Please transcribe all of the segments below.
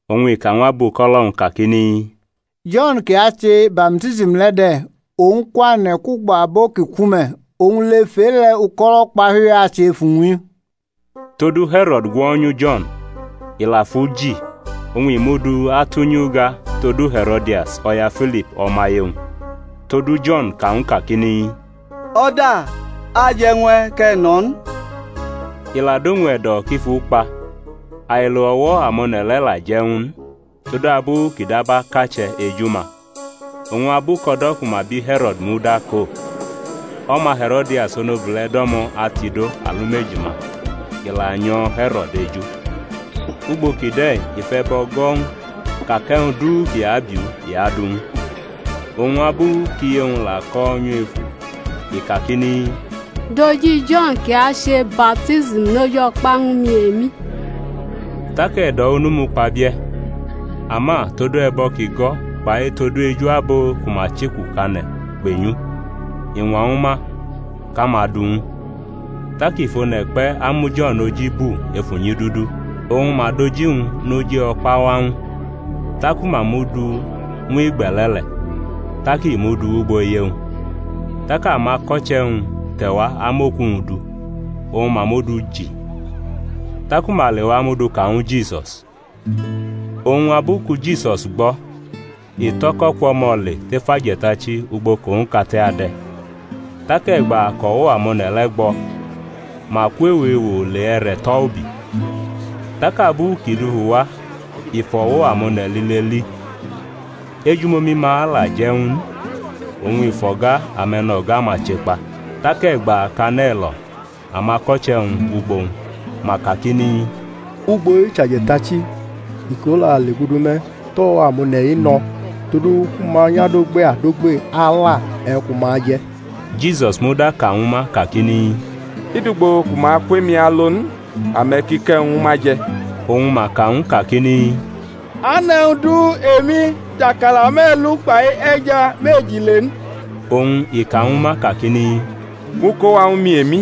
Oñ i ka ñw abuko̩lo̩-wñ kakini, Jo̩n kʼi ache baptism le̩ de̩, owñ kwane̩ kwugbo abo ki ku me̩; oñ lef e-le̩ uko̩lo̩ ukpahiu-i ache ef uwñ. Todu He̩ro̩d gwo̩nyu Jo̩n, i la fʼu ji, oñ i mʼu du atʼunyi uga todu He̩ro̩dias, o̩ya Filip o̩maye-wñ. Todu Jo̩n ka ñw u kakini, O̩da aje̩ ñw e̩ kʼe̩ nʼo̩ n. I la dʼowñ e̩do̩ kʼi fʼu kpa, ailo o̩wo̩ amone̩ le̩ la je̩ ñw u n, todabu kʼi dab akache̩ eju-ma. Oñ abu kʼo̩do̩ ku ma bi He̩ro̩d muda ko, o̩ma He̩ro̩dias onobule̩ do̩mo̩ atido alumeji-ma i la nyo̩ He̩ro̩d eju. Ugbo kide̩ i fʼe̩bo̩ go̩ ñw u ka kʼe̩wñ du kʼi abiʼu i adʼu ñw u. Oñ abu kʼiye-wñ la ko̩ nyefu i kakini, Dʼoji Jo̩n kʼi ache baptism noj o̩kpa ñwu mi emi. Tak e̩do̩ onu mukpabie̩, ama tod e̩bo̩ kʼi go̩ kpai tod eju abo ku ma chekukane̩ kpenyʼu, i ñwa ñwu ma kʼama du ñw u. Tak i fʼone̩ kpe̩ amu Jo̩n oji bu ef unyidudu, oñ ma dʼoji-wñ noj o̩kpa wa ñw u, taku ma mʼu du ñw igbe̩le̩ le̩, tak i mʼu du wʼugbo iye-wñ. Tak amako̩che̩-wñ te̩wa amʼoku-wñ du, oñ ma mʼu du ji, taku ma lewa mʼu du ka ñwu Jisus. Oñ abu ku Jisus gbo̩ i tʼo̩ko̩ kwʼo̩mo̩ le tef aje̩tachi ugbo kʼowñ kate ade̩. Tak e̩gba kʼo̩wo̩ amone̩ le̩ gbo̩, ma kwʼewo ewo le e̩re̩ tʼo̩ ubi. Tak abu kʼi dufu wa i fʼo̩wo̩ amone̩ lile li. Ejumomi-ma la je̩ ñw u n, oñ i fʼo̩ga ame̩no̩ga-ma che kpa. Tak e̩gba kʼane̩ lo̩ amako̩che̩-wñ wʼugbo-wñ, ma kakini, Ugbo-i chʼaje̩tachi, iko la legudu me̩; tʼo̩wo̩ amone̩-i no̩ todu ku ma nyʼadogbe adogbe ala e̩wñ ku ma aje̩. Jisus muda ka ñwu ma kakini, i dʼugbo ku ma kwʼemi alo n, ame̩ ki kʼe̩wñ ñwu ma je̩. Oñ ma ka ñw u kakini, A nʼe̩wñ du emi tʼakala me̩lu kpʼe̩ja meji le n. Oñ i ka ñwu ma kakini, Mʼu ko wa ñwu mi emi.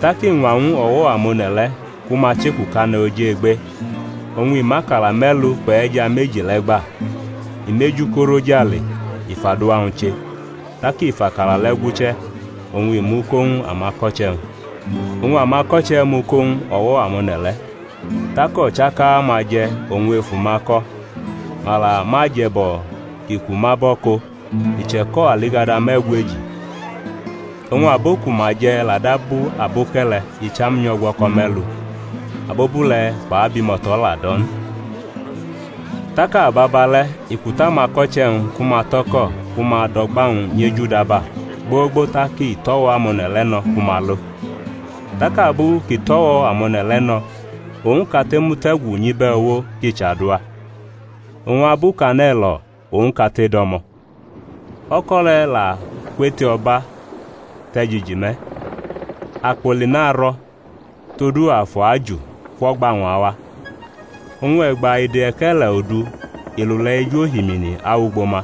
Tak i ñwa ñw o̩wo̩ amone̩ le̩ ku ma chekukane̩ oj egbe oñ i mʼakala me̩lu kpʼe̩ja meji le̩ gba, i mʼeju korʼojale, i fʼaduwa-wñ che; tak i fʼakala le̩ guche̩, oñ i mʼu ko ñw amako̩che̩-wñ, oñ amako̩che̩ mʼu ko ñw o̩wo̩ amone̩ le̩. Tak o̩chaka-ma je̩ oñ efu-ma ko̩. Ma la mʼaje̩bo̩ kʼi ku ma bo̩ ko̩, i che̩ko̩ aligada me̩gweji. Oñ abo ku ma je̩ la dab aboke̩le̩ icham nyʼo̩gwo̩ko̩ me̩lu, abobule̩ kpʼabimo̩to̩ la dʼo̩ n. Tak ababale̩ i kutʼamako̩che̩-wñ ku ma tʼo̩ko̩ ku ma dʼo̩gba-wñ nyʼejudaba, gbogbo tak i tʼo̩wo̩ amone̩ le̩ no̩ ku ma lo. Tak abu kʼi tʼo̩wo̩ amone̩ le̩ no̩ owñ kate mute̩gu nyʼibe̩ uwo kʼi chaduwa. Oñ abu kʼane̩ lo̩ owñ kate do̩mo̩. O̩ko̩ le̩ la kwʼeto̩ba te̩ jiji me̩, akpoli narʼo̩, todu afu aju kwʼo̩gba-wñ awa. Oñ e̩gba ide e̩ke̩le̩ odu i lule̩ ej ohimini awʼugbo ma.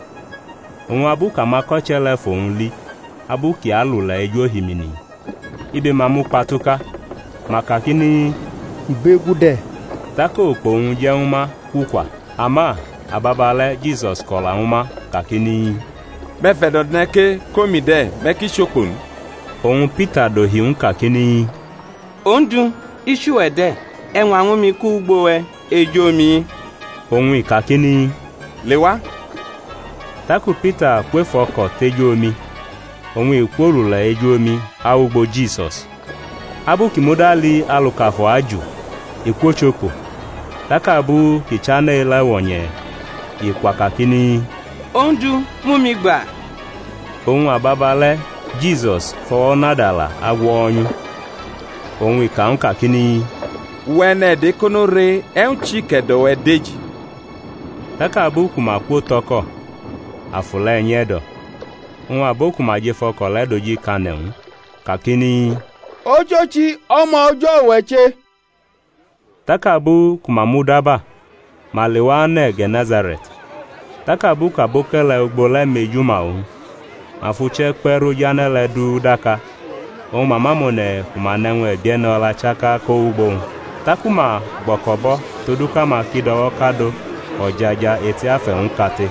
Oñ abu kʼamako̩che̩ le̩ fʼowñ li abu kʼi alule̩ ej ohimini, ibe-ma mukpatuka, ma kakini, Ibegu de̩! Tak okpo-wñ je̩ ñwu ma kwukwa. Ama ababale̩ Jisus ko̩la ñwu ma, kakini, Me̩ fʼe̩do̩ ne̩ ke, kʼomi de̩, me̩ ki chokpo n. Oñ Pita dohi ñw u kakini, Ondu, i chʼuwe̩ de̩, e̩ ñwa ñwu mi kʼu wʼugbo we̩ ej omi-i. Oñ i kakini, Lewa. Taku Pita kwʼef o̩ko̩ tej omi, oñ i kwolule̩ ej omi awʼugbo Jisus; abu kʼi muda li alu kʼafu aju, i kwochokpo, tak abu kʼi chane̩ elawo̩nye̩ i kwa kakini, Ondu, mʼumi gba. Oñ ababale̩ Jisus fʼo̩wo̩ nadala agwo̩nyʼu, oñ i ka ñw u kakini, Uwe̩ e̩ne̩do̩ ekono re, e̩wñ chi kʼe̩do̩-we̩ deji? Tak abu ku ma kwotʼo̩ko̩, afu le̩ nye̩do̩. Oñ abo ku ma jʼef o̩ko̩ le̩ dojikane̩ ñw u, kakini, Ochochi, O̩ma O̩jo̩ uwe̩ che. Tak abu ku ma mudaba, ma lewa ane̩ Ge̩ne̩sare̩t. Tak abu kʼaboke̩le̩ ugbo le̩ mejuma owñ, ma fʼuche̩ kpe̩ rʼoj ane̩ le̩ du daka, oñ ma mʼamone̩ ku ma nʼe̩wñ e̩bie̩ne̩ o̩la chaka ko wʼugbo-wñ. Taku ma gbo̩ko̩bʼo̩ todu kʼama ki do̩wo̩kado o̩jaja eti afe̩-wñ kate,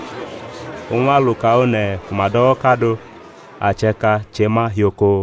oñ aluka one̩ ku ma do̩wo̩kado, ache̩ka che ma hioko.